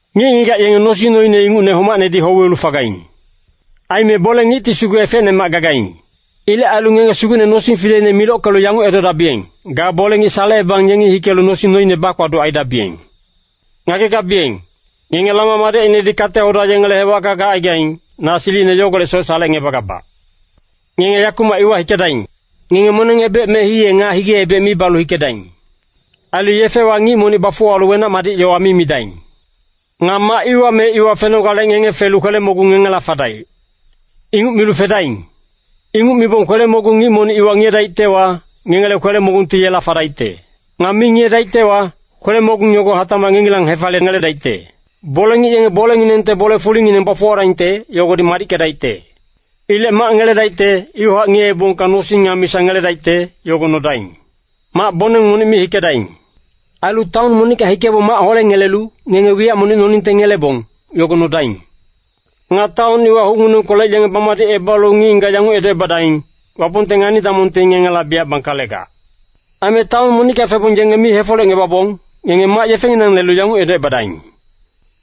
“Ngic-ngigac yenge nosing noine ingucne homacnedi houwelu fagaing. Aime bole-ngicti sugu efecnemac gagaing. Ilec ailu ngenge Sugucne nosing fileine milockelu yanguc edodabiyeng, ‘Ga bole-ngic salecebang yengi hikelu nosing noine bakpaduc aidabiyeng.’ Ngagegabiyeng, ngenge lama madecinedi kate-hoda yengele hewacka gacaigaing, na silicine yogolecsoc salecngebagabac. Ngenge yakumac iwa hikedaing! Ngenge moneng-ebec me hiye nga hige-ebec mi balu hikedaing. Ailu yefewa ngic monic bafuwalu wenac-madic yowa mi midaing. “Nga mac iwa me iwa fenogale ngenge felu ‘Kwele-mogung ngengela fadaic!’ Inguc milu fedaing. Inguc mibong kwele-mogung ngic monic iwa ngiyedaictewa, ngengele kwele-mogungti yela fadaicte. Nga mi ngiyedaictewa, kwele-mogung yogo hatacmac ngengilang hefaliyengeledaicte. Bole-ngic yenge bolenginengte bole-fulingineng bafuwadaingte, yogodi madickedaicte. Ilec mac ngeledaicte, iwahac ngiyeebongka nosing nga misa ngeledaicte, yogo nodaing. Mac-boneng monic mi hikedaing. “Ailu taon monicka hikebong mac holengelelu, ngenge wiyac monic noningte ngelebong, yogo nodaing. Nga taon iwa hucnginengkolec yenge bamadicebalu ngic-ngigac yanguc edocebadaing, ‘Wapongte ngani-damongti ngengela biyac bangkalegac.’ Aime taon monicka febong yenge mi hefolecngebabong, ngenge mac yefenginang lelu yanguc edocebadaing,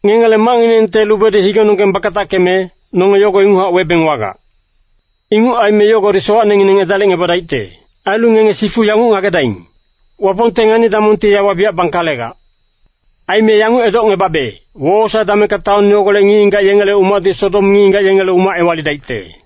‘Ngengele macnginengte lubedi higenonggeng bakatackeme, nonge yogo inguchac webeng wagac. Inguc aime yogodi sowacnengineng edalicngebadaicte. Ailu ngenge sifu yanguc ngagedaing! Wapongte ngani-damongti yawa biyac bangkalegac.’ Aime yanguc edocngebabe, wowosae damengka taon yogolec ngic-ngigac yengele umacti Sodom ngic-ngigac yengele umac ewalidaicte.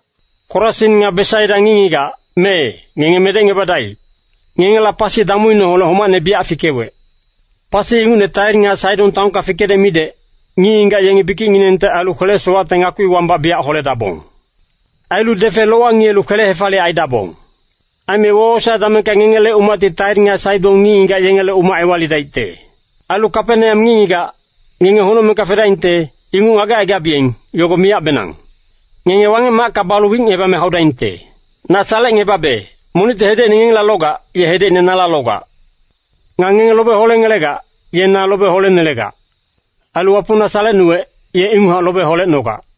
“Korasin nga Besaida ngic-ngigac, mee, ngenge medecngebadaic. Ngengela pasi damuineholec homacne biyac fikewec. Pasi ingucne Tair nga Saidon taonka fikedec midec, ngic-ngigac yenge bikicnginengte ailu kwele-sowacte ngakpi wambac biyac holedabong. Ailu defe lowa ngiyelu kwele-hefaliyec aidabong. Aime wowosae damengka ngengele umacti Tair nga Saidon ngic-ngigac yengele umac ewalidaicte. Ailu Kapeneam ngic-ngigac, ngenge honocmengka fedaingte, inguc ngagecaigabiyeng, yogo miyacbenang. Ngenge Wangec-macka balu wicngebame haudaingte. “Na salecngebabe, monicti hedecine ngengela logac, ye hedecine nala logac. Nga ngenge lobe holengelegac, ye na lobe holenelegac. Ailu Wapong na salecnuwec, ye inguchac lobe holecnogac.”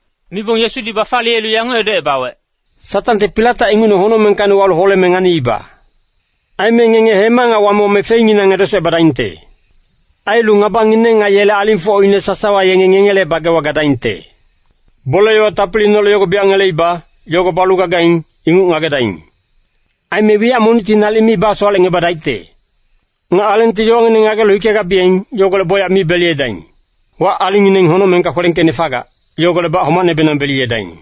Mibong Yesudi bafaliyelu yanguc edocebawec, “Satangti pilatac ingucne honocmengkacni walu holeme nganiiba. Aime ngenge hema nga wame-wame fenginang edesocebadaingte. Ailu ngabangineng nga yele alingfocine sasawa yenge ngengele bagewa gadaingte. Bole-yowa tapiliineholec yogo biyac ngeleiba, yogo balu gagaing, inguc ngagedaing. Aime wiyac monicti nalic mi basowalecngebadaicte. Nga alengti yowangineng ngagelu hikegabiyeng, yogolec bocyac mi beliyedaing. Wac-alingngineng honocmengka kwelengkeicne fagac, yogolecbac homacnebenang beliyedaing.”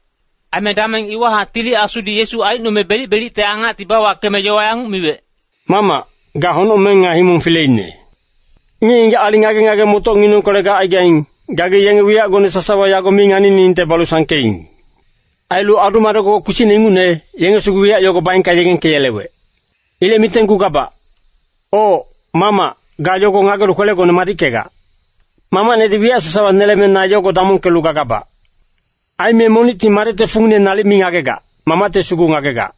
Aime dameng iwahac Tili Asudi Yesu aicnome belic-belicte angacti bawakeme yowa yanguc miwec, “Mamac, ga honocmeng nga himong fileine. Ngic-ngigac aling ngage-ngage-motocnginengkolec gacaigaing, gagi yenge wiyacgone sasawa yago mi nganiningte balu sangkeing. Ailu adu-madec-gogoc kpisicne ingucne, yenge sugu wiyac yogo baengka yegengkeyelewec. Ilec mitenggugabac. Oc, Mamac, ga yogo ngagelu kwelegone madickegac. “Mamacnedi wiyac sasawa neleme na yogo damongkelu gagabac. Aime monicti Madecte fungine nalic mi ngagegac, Mamacti sugu ngagegac.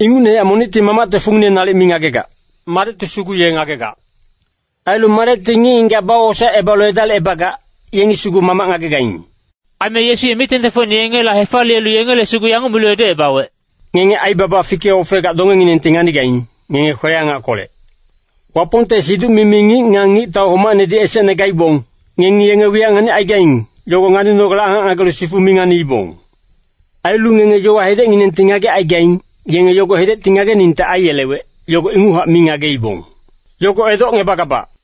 Ingucnehac monicti Mamacte fungine nalic mi ngagegac, Madecti sugu ye ngagegac. Ailu Madecti ngic-ngigac bawosaecebalu edalicebagac, yengi sugu Mamac ngagegaing.” Aime Yesu ye mic-tengtengfocine yengela hefaliyelu yengele sugu yanguc milu edocebawec, “Ngenge aibaba fike-ofegac dongenginengti nganigaing, ngenge kwele-angackolec. Wapongte siduc-mimi ngic nga ngictau homacnedi esecne gaibong, ngengi yenge wiyac nganicaigaing, yogo nganinogale angac ngagelu sifu mi nganiibong. Ailu ngenge yowa hedecnginengti ngagecaigaing, yenge yogo hedecti ngageningte aiyelewec, yogo inguchac mi ngageibong. Yogo edocngebagabac.”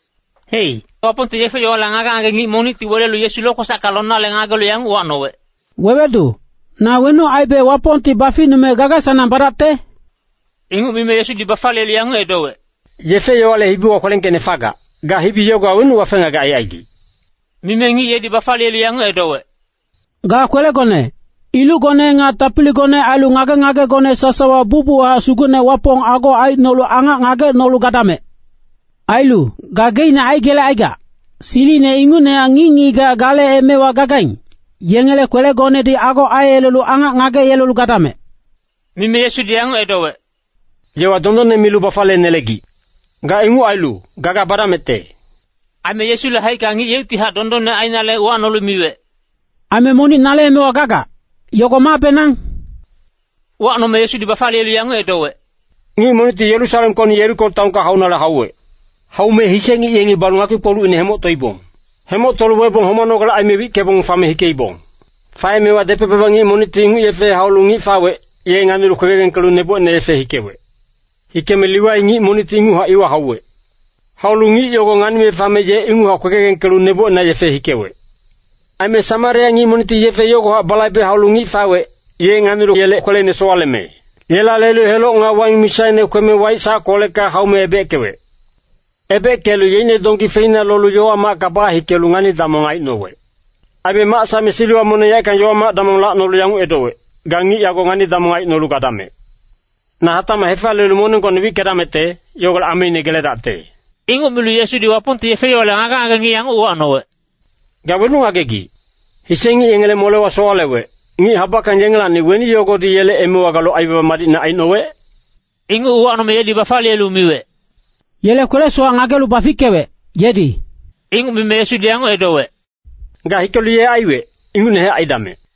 Hei, Wapongte yefe-yowale ngage-ngage ngic monicti welelu Yesu lokwesacka lonale ngagelu yanguc uwacnowec, “Wewedu, na wenuc aibe Wapongti baficnume gaga-sanang badacte?” Inguc mime Yesudi bafaliyelu yanguc edowec, “Yefe-yowale hibiwa kwelengkeicne fagac, ga hibi yogowa wenuc wafe-ngagec aicaigic?” Mime ngic yedi bafaliyelu yanguc edowec, “ ‘Ga kwelegone, ilucgone nga tapiligone ailu ngage-ngagegone sasawa bucbuchac Sugucne Wapong ago aicnolu angac ngagecnolu gadamec!’ Ailu, ‘Gageicne aigelecaigac, silicine ingucnehac ngic-ngigac gale emewa gagaing, yengele kwelegonedi ago aiyelelu angac ngageyelelu gadamec!’” Mime Yesudi yanguc edowec, “Yowa dondonne milu bafaliyenelegic. Ga inguc ailu, gaga badamecte.” Aime Yesule haicka ngic yeuctihac dondonne ainale uwacnolu miwec, “Aime monic nale emewa gagac, yogo mabenang?” Uwacnome Yesudi bafaliyelu yanguc edowec, “Ngic monicti Yerusalemkocni Yeriko taonka haunale hauwec. Haume hise ngic yengi balu ngakpi-kpolucine hemoctoibong. Hemoctolu webong homanogale aime wickebong fame hikeibong. “Faemewa depec-baba ngic monicti inguc yefe haulu ngic fawec, ye nganilu kwegegengkelu nebocina yefe hikewec. Hikeme Liwai ngic monicti inguchac iwa hauwec. Haulu ngic yogo nganime fame ye inguchac kwegegengkelu nebocina yefe hikewec. Aime Samaria ngic monicti yefe yogohac balaibelu haulu ngic fawec, ye nganilu yele kweleine sowaleme, yela lelu heloc nga waing misaine kweme waic sackolecka haume ebeckewec. Ebeckelu yeicne donggi feina lolu yowa-macka bahikelu ngani-damong aicnowec. “Aime mac saeme siliwa moneng yaeckang yowa-mac damong lacnolu yanguc edowec, ‘Ga ngic yago ngani-damong aicnolu gadamec! Na hatacmac hefaliyelu moneng gocne wickedamecte, yogolec ameine geledacte.’” Inguc milu Yesudi Wapongte yefe-yowale ngage-ngage ngic yanguc uwacnowec, “Ga wenuc ngagegic? Hise ngic yengele molewa sowalewec, ngic habackang yengelacni weni yogodi yele emewa galu aibaba madicne aicnowec?” Inguc uwacnome yedi bafaliyelu miwec, “Yele kwele-sowac ngagelu bafickewec, yedi.” Inguc mime, Yesudi yanguc edowec, “Ga hikelu ye aiwec, ingucnehac aidamec!”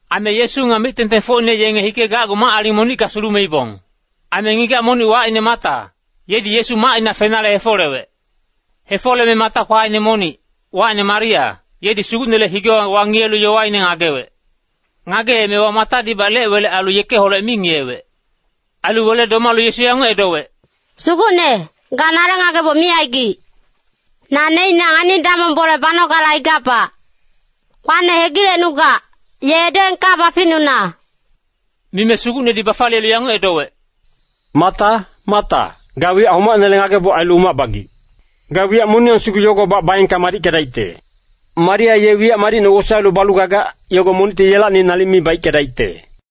Aime Yesu nga mic-tengtengfocine yenge hikegacgu mac-aling monicka sulumeibong. Aime ngigac monic wacine Mata, yedi Yesu macina fenale hefolewec. Hefoleme Mata kwaine monic, wacine Maria, yedi Sugucnele higewa wangiyelu yowaine ngagewec. Ngageemewa Matadibac lec-welec ailu yekeholec mi ngiyewec. Ailu wele domalu Yesu yanguc edowec, “Sugucne, ga nale ngageboc mi aigic. Na neicnac ngani-damong bole banogale aigabac. Kwane hegilecnugac, ye edoengka baficnuna.” Mime Sugucnedi bafaliyelu yanguc edowec, “Mata, Mata, ga wiyac homacnele ngageboc ailu umac bagic. Ga wiyac moniyang sugu yogobac baengka madickedaicte. Maria ye wiyac madicne wosaelu balu gagac, yogo monicti yelacni nalic mi baickedaicte.”